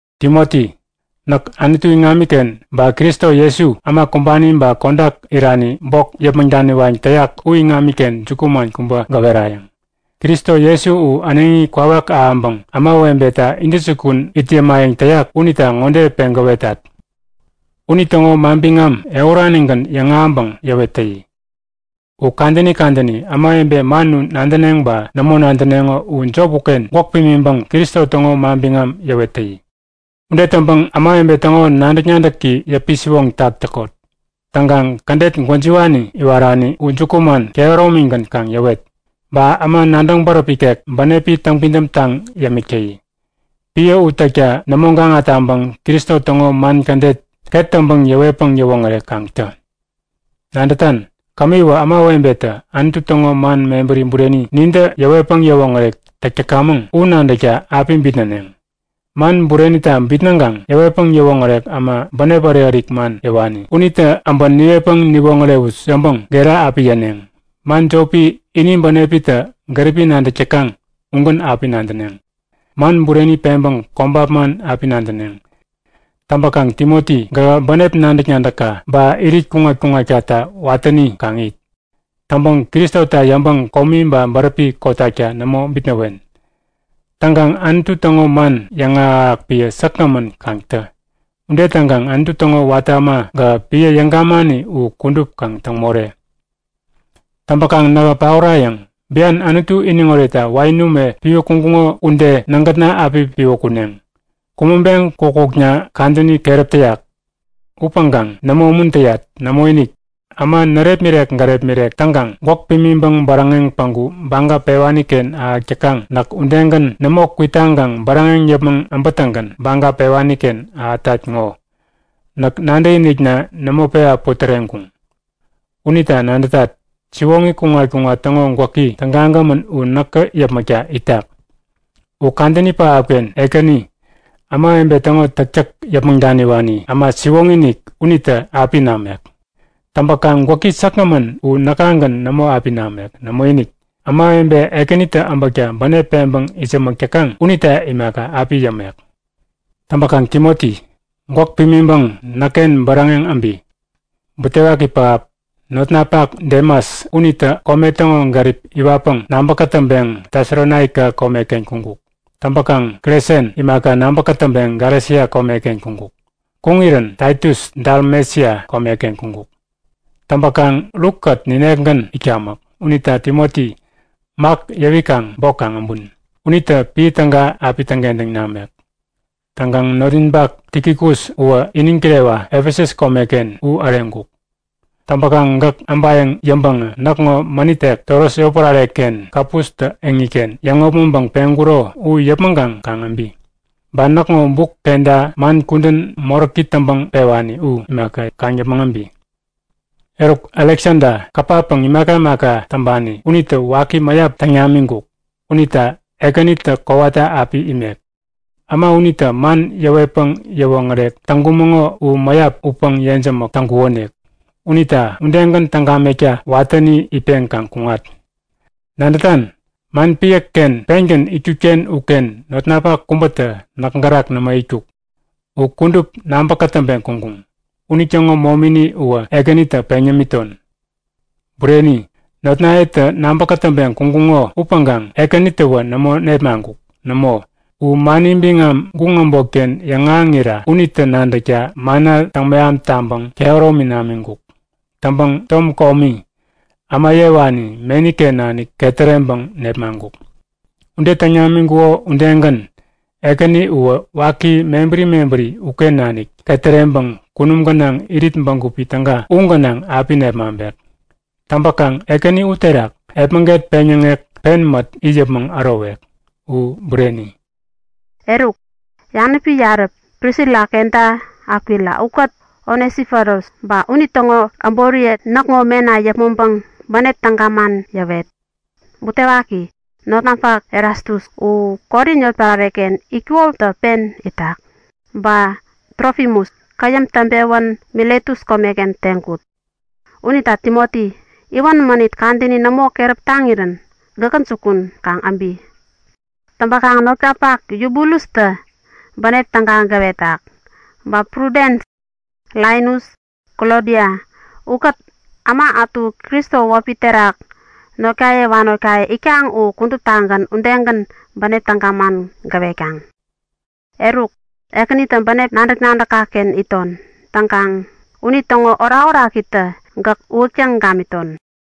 Timoti, näk Anutu iŋamiken ba Kristo Jesu äma kumbani ba kodak irani bok yäpmäŋ daniwayäŋ täyak u iŋamiken jukuman kubä gäwerayäŋ. Kristo Jesu u äneŋi kwawak ahäŋpäŋ ämawebeta intäjukun it yämayäŋ täyak unita ŋode peŋ gäwetat; Unitäŋo manbiŋam ehuranigän yäŋahäŋpäŋ yäwet täyi. U kadäni kadäni, ämawebe man u nadäneŋ ba nämo nadäneŋo u jop uken gwäk pimiŋpäŋ Kristo täŋo manbiŋam yäwet täyi. Ude täŋpäŋ ämawebe täŋo nadäk-nadäki yäpi-siwoŋtak täkot. Täŋkaŋ kädet gwäjiwani iwarani u jukuman kehäromigän kaŋ yäwet. Ba äma nadäŋ bäräp ikek bänepi täŋpidäm taŋ yämik täyi. Piä u täkta nämo gaŋa taŋpäŋ Kristo täŋo man kädet ket täŋpäŋ yäwetpäŋ yäwoŋärek kaŋ tä. Nadätan, kämiwä ämawebetä Anutu täŋo man mebäri bureni nintä yäwetpäŋ yäwoŋärek täk täkamäŋ u nadäkta api bitnäneŋ. Man burenita bitnäŋkaŋ yäwetpäŋ yäwoŋärek äma bänep ärik-ärik man yäwani unita äbä niwetpäŋ niwoŋärewut yäŋpäŋ gera api yäneŋ. Man jopi ini bänepitä gäripi nadäk täkaŋ ugän api nadäneŋ. Man bureni peŋpäŋ kobap man api nadäneŋ. Täŋpäkaŋ Timoti gähä bänep nadäk-nadäkka ba irit kuŋat-kuŋatkata watäni kaŋ it. Täŋpäŋ Kristota yäŋpäŋ komi ba bäräpi kotakta nämo bitnäwen. Täŋkaŋ Anutu täŋo man yäŋahäk-ahäk piä säkgämän kaŋ tä. Ude täŋkaŋ Anutu täŋo watä äma gähä piä yäŋ-gamani u kudup kaŋ täŋ more. Täŋpäkaŋ nähä paorayäŋ. Bian Anutu iniŋ oretta wain ume piwä kuŋkuŋo ude nägätna api piwä kuneŋ. Kumäŋpeŋ kukkukna kadäni keräp täyak. Upäŋkaŋ nämo umuntäyat. Nämoinik, äma närepmirek gärepmirek täŋkaŋ gwäk pimiŋpäŋ bäräŋeŋ päŋku baga pewani-ken ahäk täkaŋ näk udegän nämo kwitaŋkaŋ bäräŋeŋ yäpmäŋ äbätäŋgän baga pewani-ken ahätat ŋo! Näk nadäkinikna nämo pewa putäreŋkuŋ. Unita nadätat, siwoŋi kuŋat-kuŋat täŋo gwäki tägagämän u näkä yäpmäkta itak. U kadäni pähapken Ekäni, ämawebe täŋo täktäk yäpmäŋ daniwani äma siwoŋi-inik unitä api namek. Täŋpäkaŋ gwäki säkgämän u näkagän nämo api namek. Nämoinik, ämawebe Ekänitä äbäkta bänep peŋpäŋ itsämäk täkaŋ unita imaka, api yämek. Täŋpäkaŋ Timoti, gwäk pimiŋpäŋ näkken bäräŋeŋ äbi. Butewaki pähap, notnapak Demas unitä kome täŋo gärip iwatpäŋ nabä kätäŋpeŋ Tesalonaika komeken kuŋkuk. Täŋpäkaŋ Kresens imaka nabä kätäŋpeŋ Galesia komeken kuŋkuk. Kuŋirän Taitus Dalmesia komeken kuŋkuk. Täŋpäkaŋ Lukkät ninekgän itkamäk. Unita Timoti, Mak yäwikaŋ bok kaŋ äbun. Unitä piä täga api täŋkentäŋ namek. Täŋkaŋ notninpak Tikikus uwä iniŋ kirewa Efesus komeken u äreŋkuk. Täŋpäkaŋ gäk äbayäŋ yäŋpäŋä näkŋo mänit tek Troas yotpärare-ken Kapustä eŋiken yäŋopmäŋpäŋ peŋkuro u yäpmäŋkaŋ kaŋ äbi. Ba näkŋo buk kenta man kudän moräki täŋpäŋ pewani u imaka, kaŋ yäpmäŋ äbi. Eruk, Aleksada kapa-päŋ imaka imaka täŋpani unitä waki mäyap täŋ namiŋkuk. Unita Ekänitä kowata api imek. Äma unitä man yäwetpäŋ yäwoŋärek täŋkumäŋo u mäyap utpäŋ yejämäk täŋkukonik. Unita udegän täŋ gamekta watäni itpeŋ kaŋ kuŋat. Nadätan? Man piäken pengän itkut-ken uken notnapak kubätä näk gärak nämo itkuk. U kudup nabä kätäŋpeŋ kuŋkuŋ. Unitäŋo momini uwä Ekänitä peŋ yämiton. Bureni, notnayetä nabä kätäŋpeŋ kuŋkuŋo upäŋkaŋ Ekänitäwä nämo nepmaŋkuk. Nämo, u mani biŋam guŋ äbotken yäŋahäŋira unitä nadäkta manna täŋmeham taŋpäŋ kehäromi namiŋkuk. Täŋpäŋ tom komi, äma yewani meni-ken nanik ketäreŋpäŋ nepmaŋkuk. Ude täŋ namiŋkuko udegän, Ekäni uwä waki mebäri mebäri uken nanik ketäreŋpäŋ kunum gänaŋ irit bägupi täga u gänaŋ api nepmaŋpek. Täŋpäkaŋ Ekäni uterak epmäget peŋyäŋek pen mät it yäpmäŋ ärowek. U bureni! Eruk, yanäpi yarä Prisila kenta Akwila ukät Onesiforus ba unitäŋo äboriye näkŋo mena yäpmäŋpäŋ bänep täga man yäwet. Butewaki, notnapak Erastus u Korin yotpärare-ken itkukotä pen itak. Ba Trofimus käyäm täŋpewän Miletus komeken teŋkut. Unita Timoti, iwän mänit kadäni nämo keräp taŋirän gäkä jukun kaŋ äbi. Täŋpäkaŋ notkapak Yubulustä bänep täga gäwetak. Ba Prudens, Linus, Klodia ukät äma ätu Kristo wäpi terak notkaye wanotkaye itkaŋ u kuduptagän udegän bänep täga man gäwetkaŋ. Eruk, Ekänitä bänep nadäk-nadäkka-ken iton. Täŋkaŋ unitäŋo orakorakitä gäk uwäktäŋ gamiton.